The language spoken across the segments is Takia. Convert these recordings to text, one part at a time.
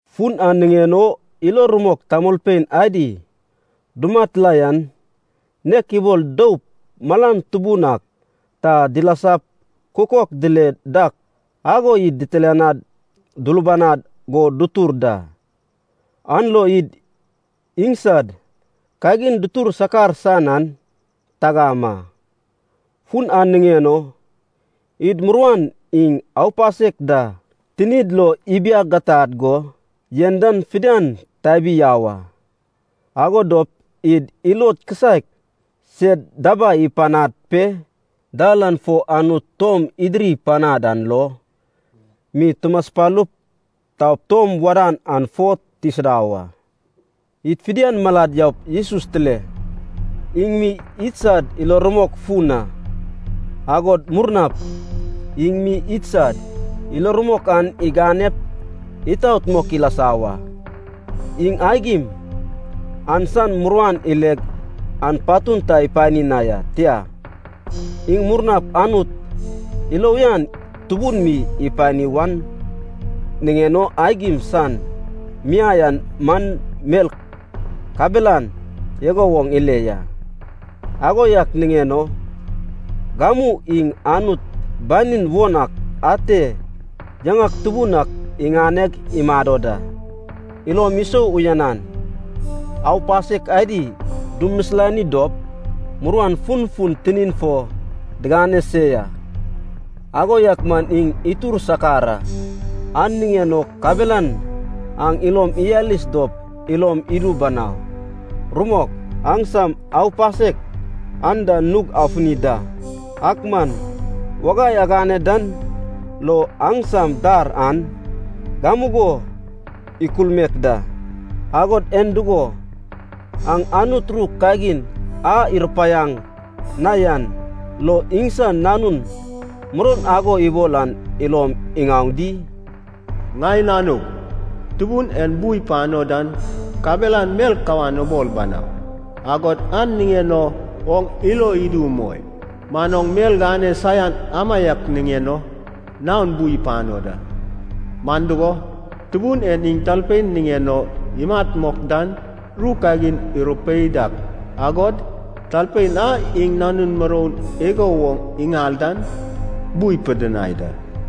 Fun an niŋen o ilo rumok tamolpein adi dumat la yan nek ibol doup malan tubun ak ta dilasap kukok dile dak ago id ditilianad dulubanad go dutur da. An lo id iŋsad kagin dutur sakar san an tagam a. Fun an niŋen o id muruan iŋ aupasek da tinid lo ibiagatad go yen dan fidian tabi yau a. Ago dop id ilod kisaek sed dabai ipanad pe dal an fo Anut tom idiri panad an lo mi tumaspalup taup tom wadan an fo tisida wa. Id fidian malad yaup Jesus tile, iŋ mi idsad ilo rumok fun a, agod murnap iŋ mi idsad ilo rumok an iganep itaot mok ilasa wa. Iŋ aigim an san muruan ileg an patun ta ipani na ya. Tia, iŋ murnap Anut ilo uyan tubun mi ipani wan niŋen o aigim san miai an man mel kabelan igo woŋ ile ya. Ago yak niŋen o gamu iŋ Anut banin won ak ate yaŋak tubun ak iŋaneg imado da. Ilom isou uyanan, aupasek adi dumisilani dop muruan funfun tinin fo digane se ya, ago yak man iŋ itur sakar a. An niŋen o kabelan aŋ ilom iyalis dop ilom idu banau. Rumok, aŋsam aupasek an da nug afuni da, ak man wagai agane dan lo aŋsam dar an gamugo ikulmaek da. Agod en dugo, aŋ Anut ru kagin a irupaiaŋ na yan lo iŋsan nanun muroun ago ibol an ilom iŋaoŋ di? “Ŋai nanug, Tubun en bu ipano dan kabelan mel kawan ubol banau, agod an niŋen o oŋ ilo idu umoi. Man oŋ mel gane saian amaiak niŋen o naon bu ipano da. Man dugo, Tubun en iŋ talpein niŋen o imat mok dan ru kagin irupei dak, agod talpein a iŋ nanun muroun igo woŋ iŋal dan bu ipidinai da.”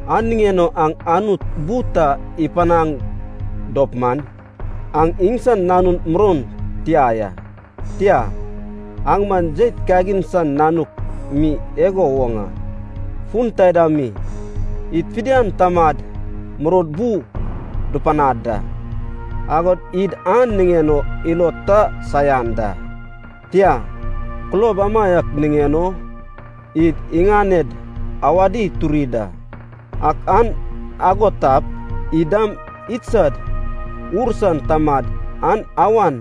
An niŋen aŋ Anut bu ta ipanaŋ dop man, aŋ iŋsan nanun muroun tia ya, tia, aŋ man jeit kagin san nanuk mi igo woŋ a. Fon taida mi, id fidian tamad muroud bu dupanad da, agod id an niŋen o ilod ta saian da. Tia, kulob amaiak niŋen o id iŋaned awadi turi da. Ak an ago tap, id dam idsad ur san Tamad an awan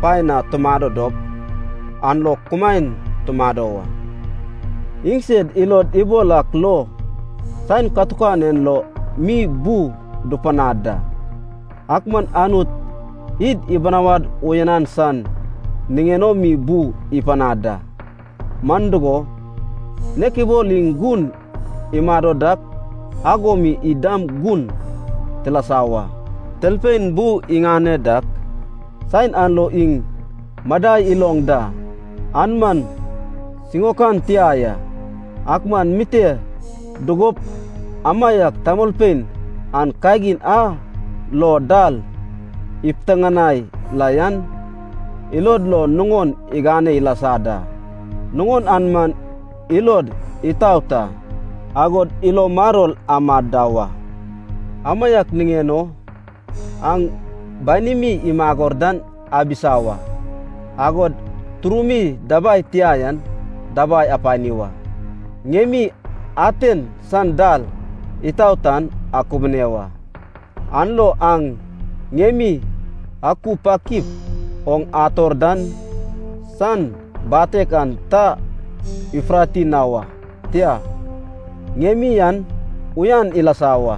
paen na tumado dop an lo kumaen tumado wa. Iŋsed ilod ibol ak lo saen katukan en lo mi bu dupanad da. Ak man Anut id ibinawad uyanan san niŋen o mi bu ipanad da, man dugo, nek ibol iŋ gun imado dak ago mi id dam gun tilasa wa. Talpein bu iŋane dak saen an lo iŋ madai iloŋ da, an man siŋaokan tia ya. Ak man mite dugup amaiak tamolpein an kagin a lo dal ipiteŋanai la yan ilod lo nuŋon igane ilasa da. Nuŋon an man ilod itaot a, agod ilo maror amad da wa. Amaiak niŋen o aŋ banimi imagor dan abisa wa, agod turumi dabai tia yan dabai apani wa. Ŋiemi aten san dal itaot an akubune wa. An lo aŋ ŋiemi akupakip oŋ ator dan san batek an ta ifurati na wa, tia, ŋiemi an uyan ilasa wa.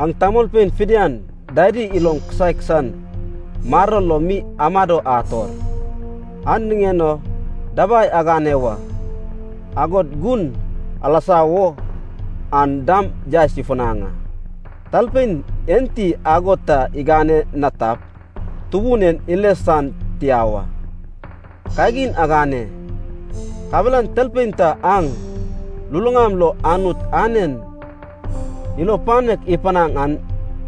Aŋ tamolpein fidian dadi ilom kisaek san maror lo mi amado ator, an niŋen o dabai agane wa. Agod gun alasa wo an dam yaes ifunaŋ a. Talpein enti ago ta igane na tap, Tubun en ile san tia wa. Kagin agane, kabelan talpein ta aŋ luluŋam lo Anut anen ilo panek ipanaŋ an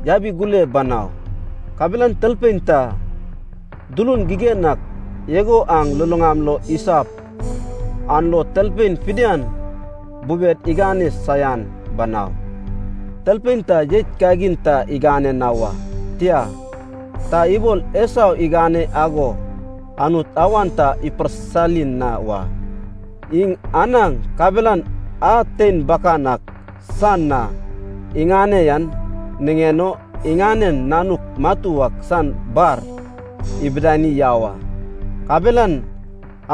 yabigule banau. Kabelan talpein ta, dulun gigen ak igo aŋ luluŋam lo isap, an lo talpein fidian bubed igane saian banau. Talpein ta jeit kagin ta igane na wa. Tia, ta ibol Esau igane ago Anut awan ta iparsisali na wa. Iŋ anaŋ kabelan a tein bakan ak san na iŋane yan niŋen o iŋanen nanuk matu ak san bar ibidani yau a, kabelan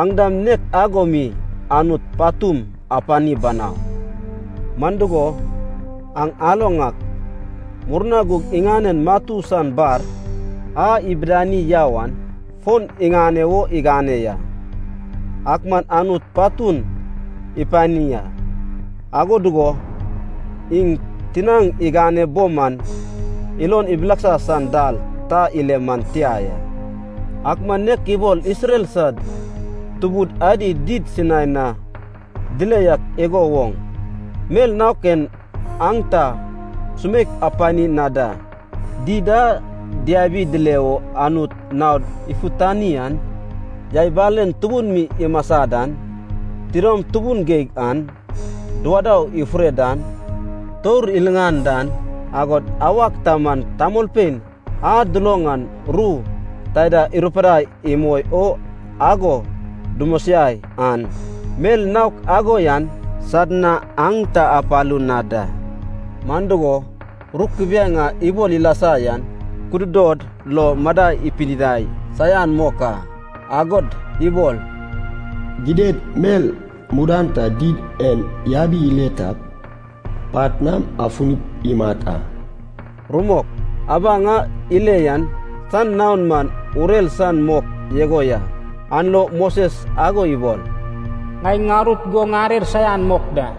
aŋ dam nek ago mi Anut patum apani banau. Man dugo aŋ aloŋ ak, murna gug iŋanen matu san bar a ibidani yau an fon iŋane wo igane ya, ak man Anut patun ipani a. Ago dugo iŋ tinaŋ igane bo man ilon ibileksa san dal ta ile man tia ya. Ak man nek ibol Isrel sad tubud adi did Sinai na dile yak igo woŋ mel naok en aŋ ta sumeik apani na da: did a diabi dile o Anut naod ifutani an, yai balen tubun mi imasa dan, tidom tubun geig an, duwadau ifure dan, tour iliŋan dan, agod awak ta man tamolpein a duloŋ an ru taida irupidai imoi o ago dumosiai an, mel naok ago yan sad na aŋ ta apalu na da. Man dugo, ru kubiaeŋ a ibol ilasa yan kududod lo madai ipidinai saian mok a. Agod ibol, “Gidad mel mudan ta did en yabi ile tap, pat nam afunip imat a.” Rumok, abaŋ a ile yan san naon man urer san mok igo ya, an lo Moses ago ibol, “Ŋai ŋarut go ŋarer saian mok da.”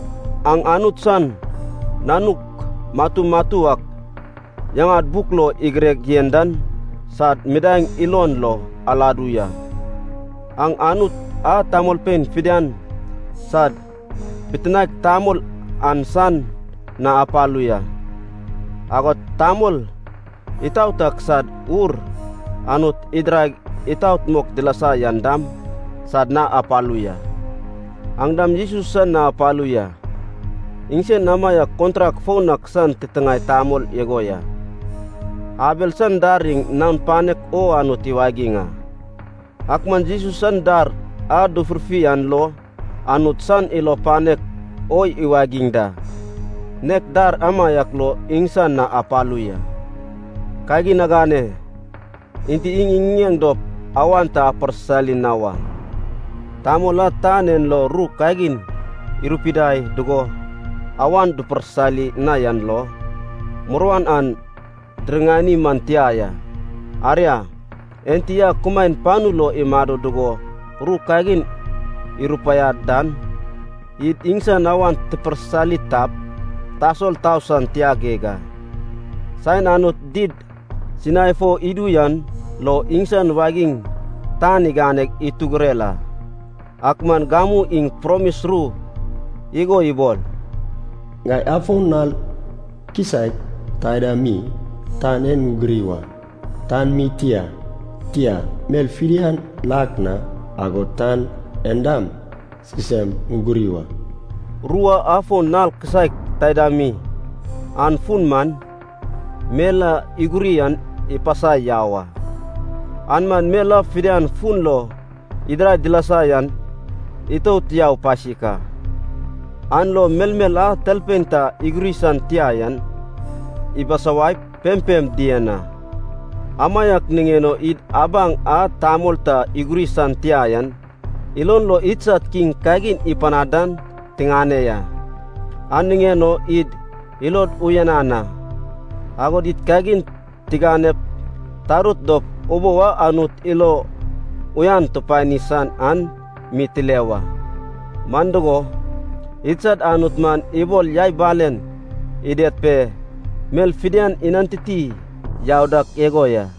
Aŋ Anut san nanuk matu matu ak yaŋad buk lo igireg yen dan sad midaeŋ ilon lo aladu ya. Aŋ Anut a tamolpein fidian sad bitinaek tamol an san na apalu ya, agod tamol itaot ak sad ur Anut idiraig itaot mok dilasa yan dam sad na apalu ya. Aŋ dam Jesus san na apalu ya. Iŋsen amaiak kontrak foun ak san titiŋae tamol igo ya. Abel san dar iŋ naon panek o Anut iwagiŋ a, ak man Jesus san dar a dufurfi an lo Anut san ilo panek o iwagiŋ da, nek dar amaiak lo iŋsan na apalu ya. Kagin agane, enti iŋ iŋiŋeŋ dop awan ta aparsisali na wa. Tamol a tan en lo ru kagin irupidai dugo awan duparsisali na yan lo, muruan an diriŋani man tia ya. Aria, Enti a kumaen panu lo imado dugo ru kagin irupaiad dan, id iŋsan awan tiparsisali tap, tasol tau san tia geig a. Saen Anut did Sinai fo idu yan lo iŋsan wagiŋ tan iganeg itugurer a. Ak man gamu iŋ promis ru igo ibol, “Ŋai afon nal kisaek taida mi tan en ŋuguri wa, tan mi tia, tia, mel fidian lak na agod tan en dam sisem ŋuguri wa.” Ru a “afon nal kisaek taida mi” an fun man, mel a iguri an ipasai yau a. An man mel a fidian fun lo idirai dilasa yan itout yau pasik a. An lo melmel a talpein ta iguri san tia yan ibisawaip pempem dien a. Amaiak niŋen o id abaŋ a tamol ta iguri san tia yan ilon lo idsad kiŋ kagin ipanad dan tiŋane ya. An niŋen o id ilod uyanan a. Agod id kagin tiganep tarut dop ubou a Anut ilo uyan tupani san an mi tile wa. Man dugo, idsad Anut man ibol yai balen ided pe mel fidian inantiti yau dak igo ya.